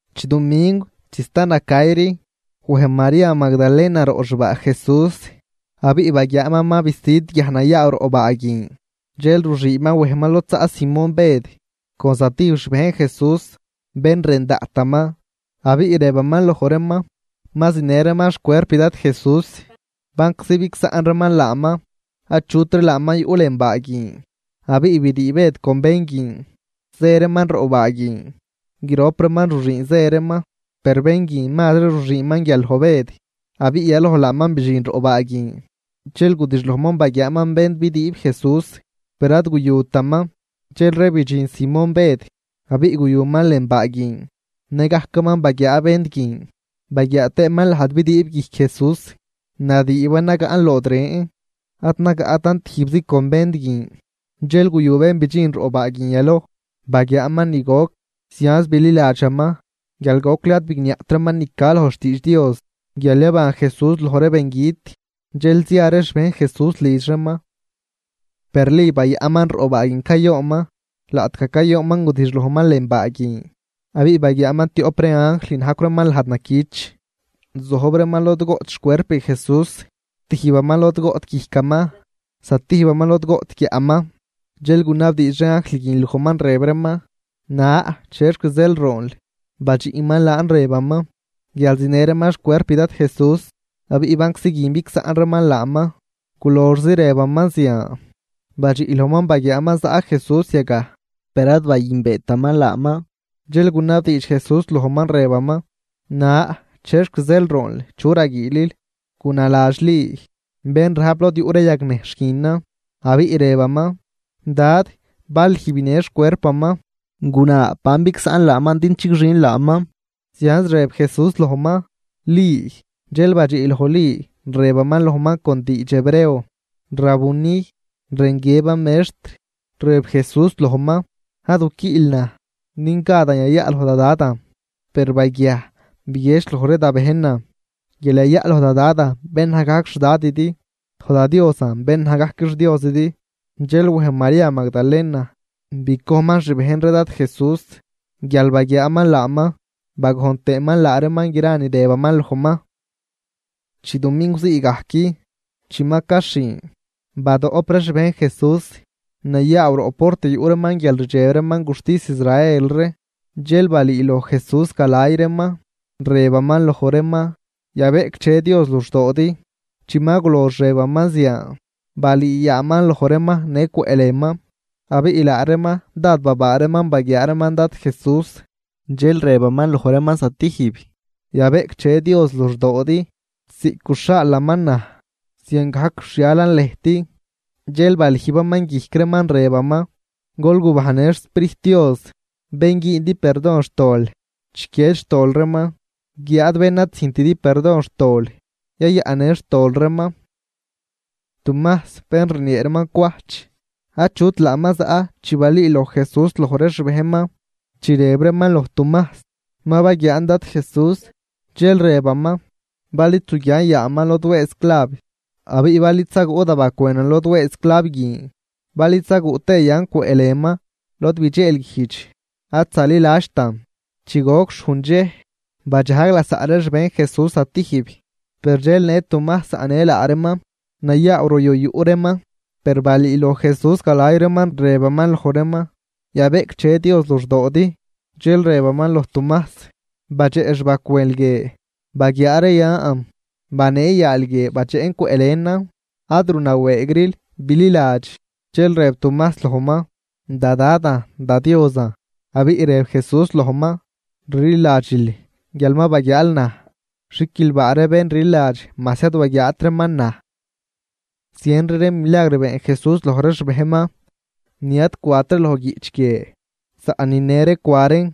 Chidumingw chi sta nacayri, wej María Magdalena roꞌ xbaa Jesús, abiꞌ baguiaaman ma bisüd guiaj nayaaw roꞌ baa guin. Dxel ruxüünman wejman lod zaꞌ Simón Bëd con zatijb xbejn Jesús, bén rën daꞌtaman, abiꞌ rëbaman loj reeman: ―Ma zinë reeman xcuerp Dad Jesús, banczi bigsaꞌn reeman laaman, achutri laaman yuꞌ lën baa guin. Abiꞌ brii Bëd con bén guin, zë reeman roꞌ baa guin. Grop reeman ruxüün zë reeman. Per bén guin mazri ruxüünman guial loj Bëd, abiꞌ yaloj laaman bidxin roꞌ baa guin. Dxel gudixlojman baguiaaman vend bidüüb Jesús, per ad guyutaman. Dxelri bidxin Simón Bëd, abiꞌ guyuman lën baa guin. Nëgajcaman baguiaa vend guin Baguiaa tëëman lajd bidüüb guijc Jesús, nadüüban nagaꞌn lood ren, ad nagaꞌtan tijbzi con vend guin. Dxel guyu bén bidxin roꞌ baa guin yaloj, baguiaaman ni goc, zianz bililadxaman, guial gocli ad bigniaꞌt reeman ni ca loj xtiidx Dios guial yaban Jesús loj ree bengüt. Dxel zia ree xbejn Jesús lidx reeman. Per Li bayaꞌnman roꞌ baa guin cayoonman. Laꞌtgaj cayoonman gudixlojman lën baa guin, abiꞌ baguiaaman tioꞌp ree anjl, najcw reeman lajd naquich, zojb reeman lod goꞌt xcuerp Jesús, tijbaman lod goꞌt guijcaman, zatijbaman lod goꞌt guiaꞌman. Dxel gunabdiidx ree anjl guin lojman, rëb reeman: ―Na, ¿chexc zeel roonl? Badxiꞌman laan rëbaman: ―Guial zinë reeman xcuerp Dad Jesús, abiꞌ banczi guin bigsaꞌn reeman laaman. Guloxzi rëbaman zian, badxiꞌ lojman baguiaaman zaꞌ Jesús yagaj, per ad bayünbeetaman laaman. Dxel gunabdiidx Jesús lojman, rëbaman: ―Na, ¿chexc zeel roonl? ¿Chu raguiilil? Gunaladx Li, bén rajp lod yuꞌ ree yagnejxh guinan, abiꞌ rëbaman: ―Dad, bal lüj binë xcuerpaman, guna ban bigsaꞌnl laaman din chigxin laaman. Zianz rëb Jesús lojman: ―¡Li! Dxel badxiꞌ loj Li, rëbaman lojman con diidx hebreo: ¡Rabuni! ―rën guiëban Mextr. Rëb Jesús lojman: ―Ad guquiꞌl naj, din gadan yayaꞌ loj da Dadan. Per baguiaj biguiedx loj ree da bejnan guial yayaꞌ loj da Dadan bén naj gajc xDadidi, loj da Diosan bén naj gajc xDiosidi. Dxel wej María Magdalena bicojnman xbejn ree Dad Jesús guial baguiaaman laaman, bagojn tëëman laa reeman gra ni rëbaman lojman. Chidumingw zii gajc chi ma caxhin, badoꞌp ree xbejn Jesús, nayaaw roꞌ port yuꞌ reeman guial rdxeb reeman guxtis Israel ree. Dxel balüüloj Jesús galay reeman, rëbaman loj reeman: ―Yabeꞌcdxe Dios luxdoodi. Chi ma gulox rëbaman zian, balüü yaaman loj reeman në cwëꞌlënman, abiꞌ laa reeman dád babaa reeman baguiaa reeman Dad Jesús. Dxel rëbaman loj reeman zatijb: ―Yabeꞌcdxe Dios luxdoodi. Ziꞌc guxhaalaman naj, ziangajc rxhialan lëjt. Dxel balüjbaman guijc reeman, rëbaman: ―Gol gubajnnë xSprijt Dios. Bén güündi perdon xtol, chiquied xtol reeman, guiáad bén ad züjntidi perdon xtol, yayaꞌnnë xtol reeman. Tumajs, bén rniee reeman Cwajch, achut laaman zaꞌ chi balüüloj Jesús loj ree xbejnman. Chi rëb reeman loj Tumajs: ―Ma baguiaan Dad Jesús. Dxel rëbaman: ―Bal id zuguian yaaman lod wëëz clav, abiꞌ bal id zaguꞌ da bacwënan lod wëëz clav guin, bal id zaguꞌ tëë yan cwëꞌlënman lod bidxeelguijdx, ad zaliladxtan. Chi goc xhujn dxej, badxajg lasaꞌ ree xbejn Jesús zatijb, per dxel në Tumajs zaꞌnë laa reeman, nayaaw ruyu yuꞌ reeman. Per balüüloj Jesús galay reeman, rëbaman loj reeman: ―Yabeꞌcdxe Dios luxdoodi. Dxel rëbaman loj Tumajs: ―Badxeꞌ xbacwënl guie, baguiaa ree yan, banee yaal guie badxeꞌn cwëꞌ lënan. Ad runawëëgril, bililadx. Dxel rëb Tumajs lojman: ―¡Da Dadan, da Diosan! Abiꞌ rëb Jesús lojman: ―Rliladxil guial ma baguiaal naj. Xiquilbaa ree bén rliladx, majs ad waguiaat reeman naj. Zienri ree milagr been Jesús loj ree xbejnman, ni ad cwat ree loj guiꞌch guie. Saꞌn nine ree cwa reen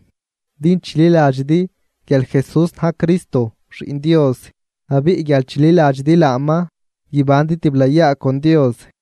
din chililadxidi guial Jesús na̱j Cristo, Xiꞌn Dios, abiꞌ guial chililadxidi laaman guibandi tiblayaa con Dios.